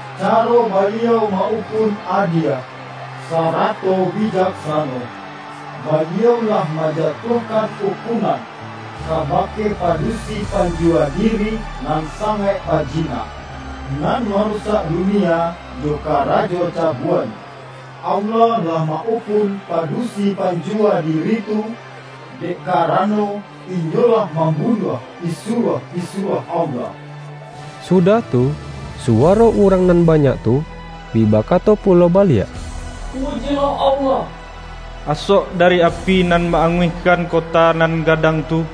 Caro Baliau ma-ukun adie, sarato bijaksano! Baliau lah manjatuahkan ukunan, kabake padusi panjuwa diri nan sangaik pajina, nan marusak dunia jo karajo cabuanyo. Allah lah ma-ukun padusi panjuwa diri tu, dek karano, inyo lah mambu-nuah pisuruah-pisuruah Allah.” Su-dah tu, suwaro urang nan banyak tu, bi bakato pulo baliak,”Pujilah Allah! Asok dari api nan ma-anguihkan kota nan gadang tu,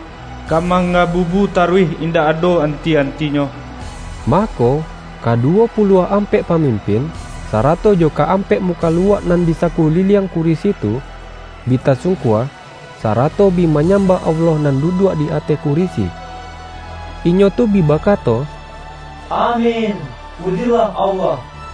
ka manggabubu taruih indak ado anti-antinyo!” Mako, ka-duwo puluah ampek pamimpin, sara-to jo ka-ampek mukaluak nan di saku-liliang kurisi tu, bi tasungkua, sarato bi manyambah Allah nan duduak di ateh kurisi. Inyo tu bi bakato,”Amin! Pujilah Allah!”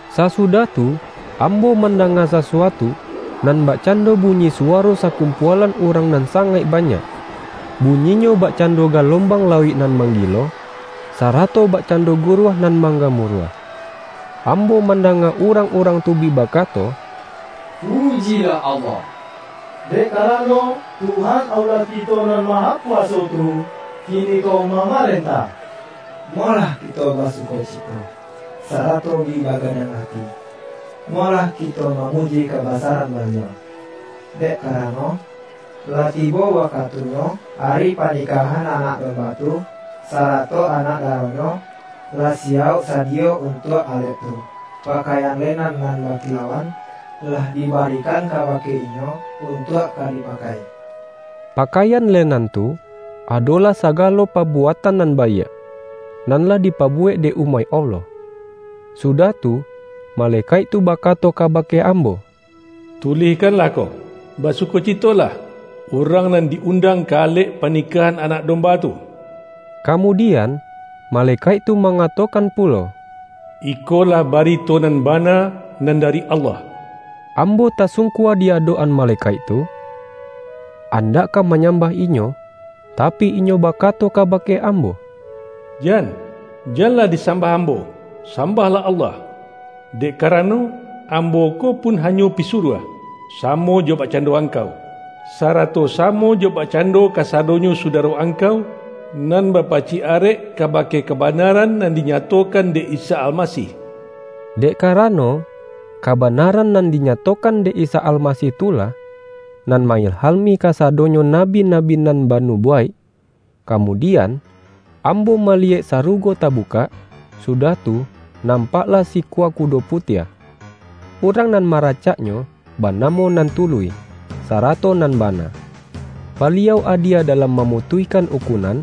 Sasudah tu, ambo mandanga sasu-atu, nan bakcando bunyi suwaro sa-kumpualan urang nan sangaik ba-nyak; bunyinyo bakcando galombang lauik nan manggilo, sarato bakcando guruah nan manggamuruah. Ambo mandanga urang-urang tu bi bakato,”Pujilah Allah! Dek karano, Tuhan Allah kito Nan Mahakuwaso tu, kiniko mamarentah! Molah kito basukoci-to, sarato bi bagadang ati; molah kito mamuji kabasaran Baliau! Dek kara-no, lah tibo wakatunyo ari panikah-an Anak Domba tu, sarato anak daro-Nyo, lah siyauk sadiyo untuak alek tu. Pakaian lenan nan bakilauan, lah di-barikan kabake inyo untuak ka dipa-kai.” (Pakaian lenan tu, adolah sagalo pabuatan nan baiak, nan lah dipabu-wek dek umaik Allah.) Sudah tu, malekaik tu bakato ka-bake ambo,”Tulihkanlah ko: ’Basuko-citolah, urang nan di-undang ka alek panikahan Anak Domba tu.’” Kamu-dian, malekaik tu mangatokan pu-lo,”Ikolah barito nan bana, nan da-ri Allah.” Ambo tasungkua di adok-an ma-lekaik tu, andak ka manyambah inyo, tapi, inyo bakato kabake ambo,”Jan! Janlah disambah ambo, sambahlah Allah! Dek karano, ambo ko pun ha-nyo pisuruah, samo jo bakcando ang-kau, sarato samo jo bakcando kasa-donyo sudaro angkau, nan bapacik arek kabake kabanaran nan dinyato-kan dek Isa Almasih!” Dek karano, kabanaran nan dinya-tokan dek Isa Almasih tu lah, nan ma-ilhami kasadonyo nabi-nabi nan ba-nubuwaik. Kamudian, ambo maliyek sarugo tabukak, sudah tu, nampaklah sikua kudo putiah. Urang nan maracaknyo, banamo Nan Tuluih, sarato Nan Ba-na. Baliau adie dalam mamutuihkan ukunan,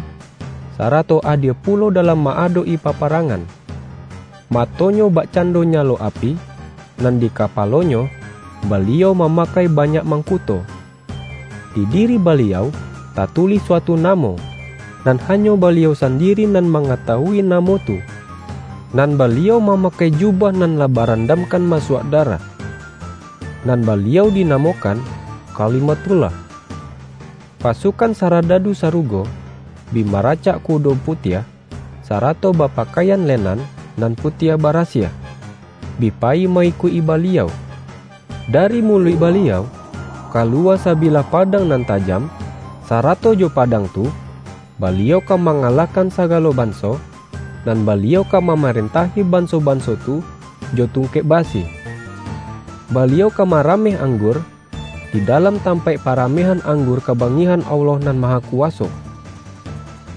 sarato adie pulo dalam ma-adok-i paparangan. Mato-Nyo bak-cando nyalo api, nan di kapalo-Nyo, Baliau mamakai banyak mangkuto. Di diri Baliau, tatulih suatu namo; nan hanyo Baliau sandiri nan mangatawui namo tu. Nan Baliau mamakai ju-bah nan lah barandamkan masuak da-rah. Nan Baliau dinamokan”Kalima-thullah”. Pasukan saradadu sarugo, bi maracak kudo putiah, sarato bapa-kaian lenan nan putiah barasiah, bi payi ma-ikuik-i Baliau. Dari muluik Baliau, kaluwa sabilah padang nan ta-jam, sarato jo padang tu, Baliau ka mangalahkan sagalo banso, nan Ba-liau ka mamarentahi banso-banso tu jo tungkek basi. Baliau ka marameh anggur, di dalam tampaik parameh-an anggur kabangihan Allah Nan Ma-hakuwaso.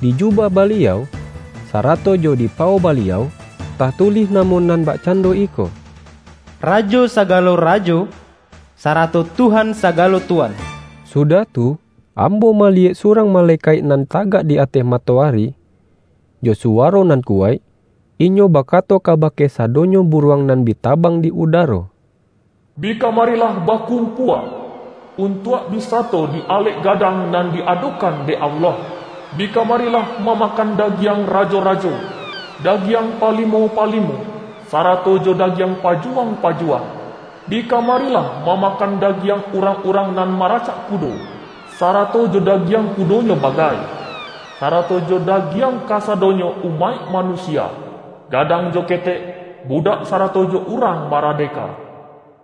Di jubah Baliau, sarato jo di pawo Baliau, tatulih namo nan bakcando iko,”Rajo sagalo rajo, sara-to Tuhan sagalo tuan.” Sudah tu, ambo maliyek surang malekaik nan tagak di ateh matoari. Jo suwaro nan kuwaik, inyo bakato kabake sadonyo buruang nan bi ta-bang di udaro,”Bi kamarilah bakum-pua, untuak bi sato di alek gadang nan di-adokan dek Allah! Bi kamarilah mamakan dagiang rajo-rajo, dagiang palimo-palimo, sa-rato jo dagiang pajuwang-pajuwang; bi kamarilah mamakan dagiang urang-urang nan maracak kudo, sa-rato jo dagiang kudonyo bagai, sara-to jo dagiang kasadonyo umaik manu-sia, gadang jo ketek, budak sarato jo urang maradeka!”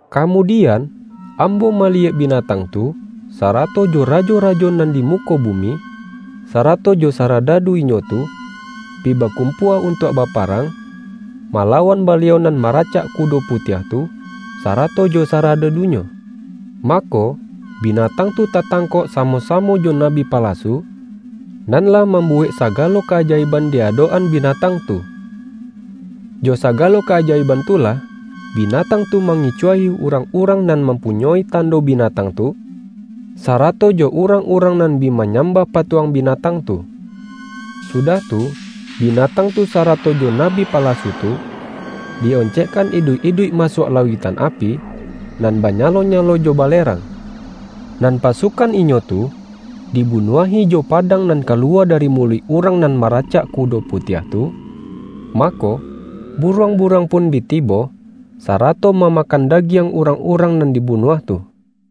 Kamudian, ambo maliyek bina-tang tu, sarato jo rajo-rajo nan di mu-ko bumi, sarato jo saradadu inyo tu, bi bakumpua untuak baparang, mala-wan Baliau nan maracak kudo putiah tu, sarato jo saradadu-Nyo. Mako, binatang tu tatangkok samo-samo jo nabi palasu, nan lah mambuwek sa-galo ka-ajaiban di adok-an binatang tu. (Jo sagalo ka-ajaiban tu lah, bina-tang tu mangicuahi urang-urang nan mampunyoi tando binatang tu, sara-to jo urang-urang nan bi manyam-bah patuang binatang tu.) Sudah tu, binatang tu sarato jo nabi palasu tu, di-oncekkan iduik-iduik masuak la-uiktan api nan banyalo-nyalo jo ba-lerang. Nan pasukan inyo tu, di-bunuahi jo padang nan kaluwa dari muluik Urang nan maracak kudo pu-tiah tu. Mako, buruang-buruang pun bi tibo, sarato mamakan dagiang urang-urang nan dibunuah tu.